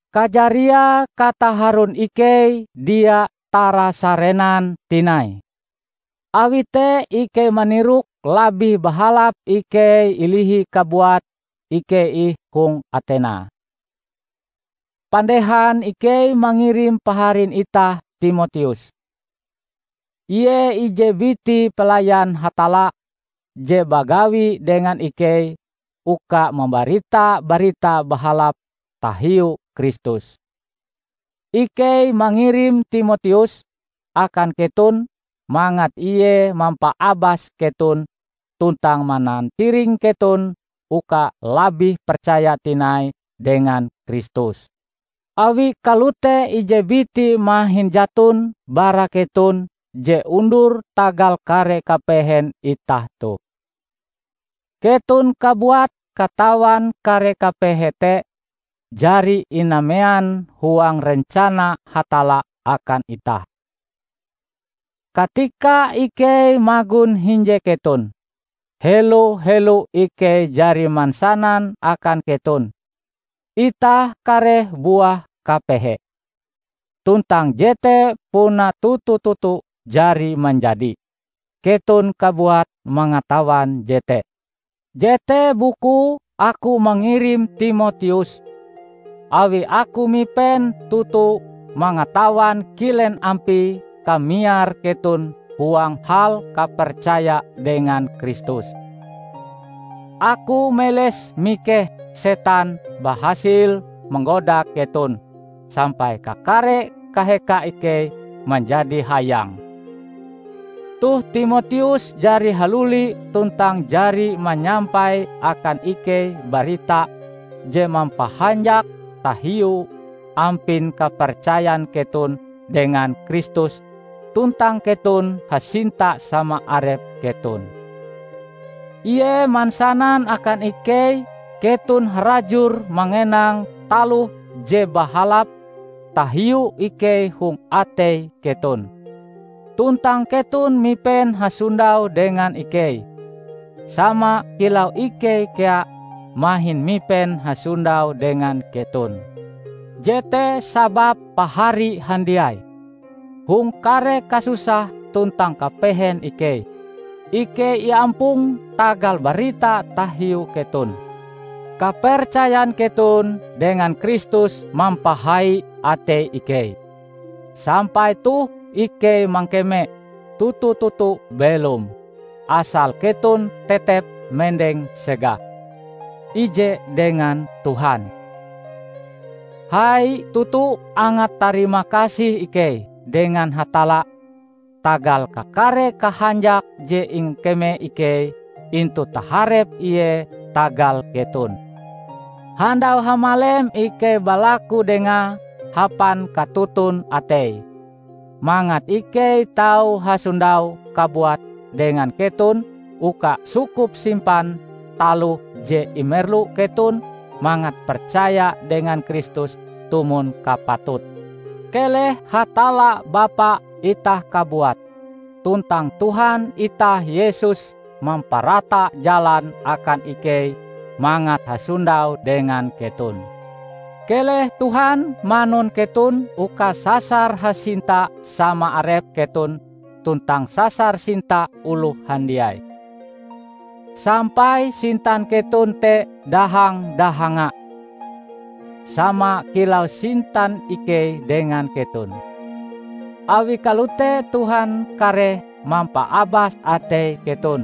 Kajariae kataharon ikei dia tarasarenan tinai. Awi te ikei manirok labih bahalap ikei ilihi kabuat ikei ih hong Atena, pandehan ikei mangirim paharin itah Timoteus. Ie ije biti pelayan Hatalla je bagawi dengan ikei uka mambarita Barita Bahalap tahiu Kristus. Ikei mangirim Timoteus akan keton mangat ie mampaabas keton tuntang manantiring keton uka labih percaya tinai dengan Kristus. Awi kalote ije biti mahin jaton bara keton je undur tagal kare kapehen itah toh. Keton kabuat katawan kare kapehe te jari inamean huang rencana Hatalla akan itah. Katika ikei magon hinje keton, helo-helo ikei jari mansanan akan keton, itah kareh buah kapehe. Tuntang jete puna toto-toto jari manjadi; keton kabuat mangatawan jete. Jete bukue aku mangirim Timoteus, awi aku mipen toto mangatawan kilen ampie kamiar keton huang hal kapercaya dengan Kristus. Aku meles mikeh setan bahasil manggoda keton sampai kakare kaheka ikei manjadi hayang. Toh Timoteus jari haluli tuntang jari manyampai akan ikei barita je mampahanjak tahiu ampin kapercayan keton dengan Kristus tuntang keton hasinta sama arep keton. Ie mansanan akan ikei keton harajur mangenang taloh je bahalap tahiu ikei hong atei keton. Tuntang keton mipen hasondau dengan ikei, sama kilau ikei kea mahin mipen hasondau dengan keton. Jete sababe pahari handiai, hong kare kasusah tuntang kapehen ikei, ikei iampong tagal barita tahiu keton. Kapercayan keton dengan Kristus mampahai atei ikei, sampai toh ikei mangkeme toto-toto belom, asal keton tetep mendeng segah, ije dengan Tuhan. Hai toto angat tarimakasih ikei dengan Hatalla tagal kakare kahanjak je ingkeme ikei intu taharep Ie tagal keton. Handau hamalem ikei balaku Dengae hapan katoton atei, mangat ikei tau hasondau kabuat dengan keton uka sukup-simpan taloh je imerlu keton mangat percaya dengan Kristus tumon kapatute. Keleh Hatalla Bapa itah kabuat, tuntang Tuhan itah Yesus mamparata jalan akan ikei mangat hasondau dengan keton! Keleh Tuhan manun keton uka sasar hasinta sama arep keton tuntang sasar sinta oloh handiai, sampai sintan keton te dahang-dahanga, sama kilau sintan ikei dengan keton. Awi kalote Tuhan kareh mampaabas atei keton,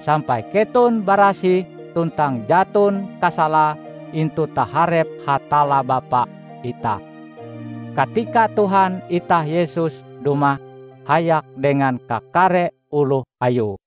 sampai keton barasih tuntang jaton kasalae intu taharep Hatalla Bapa itah, katika Tuhan itah Yesus dumah hayak dengan kakare oloh Ayue.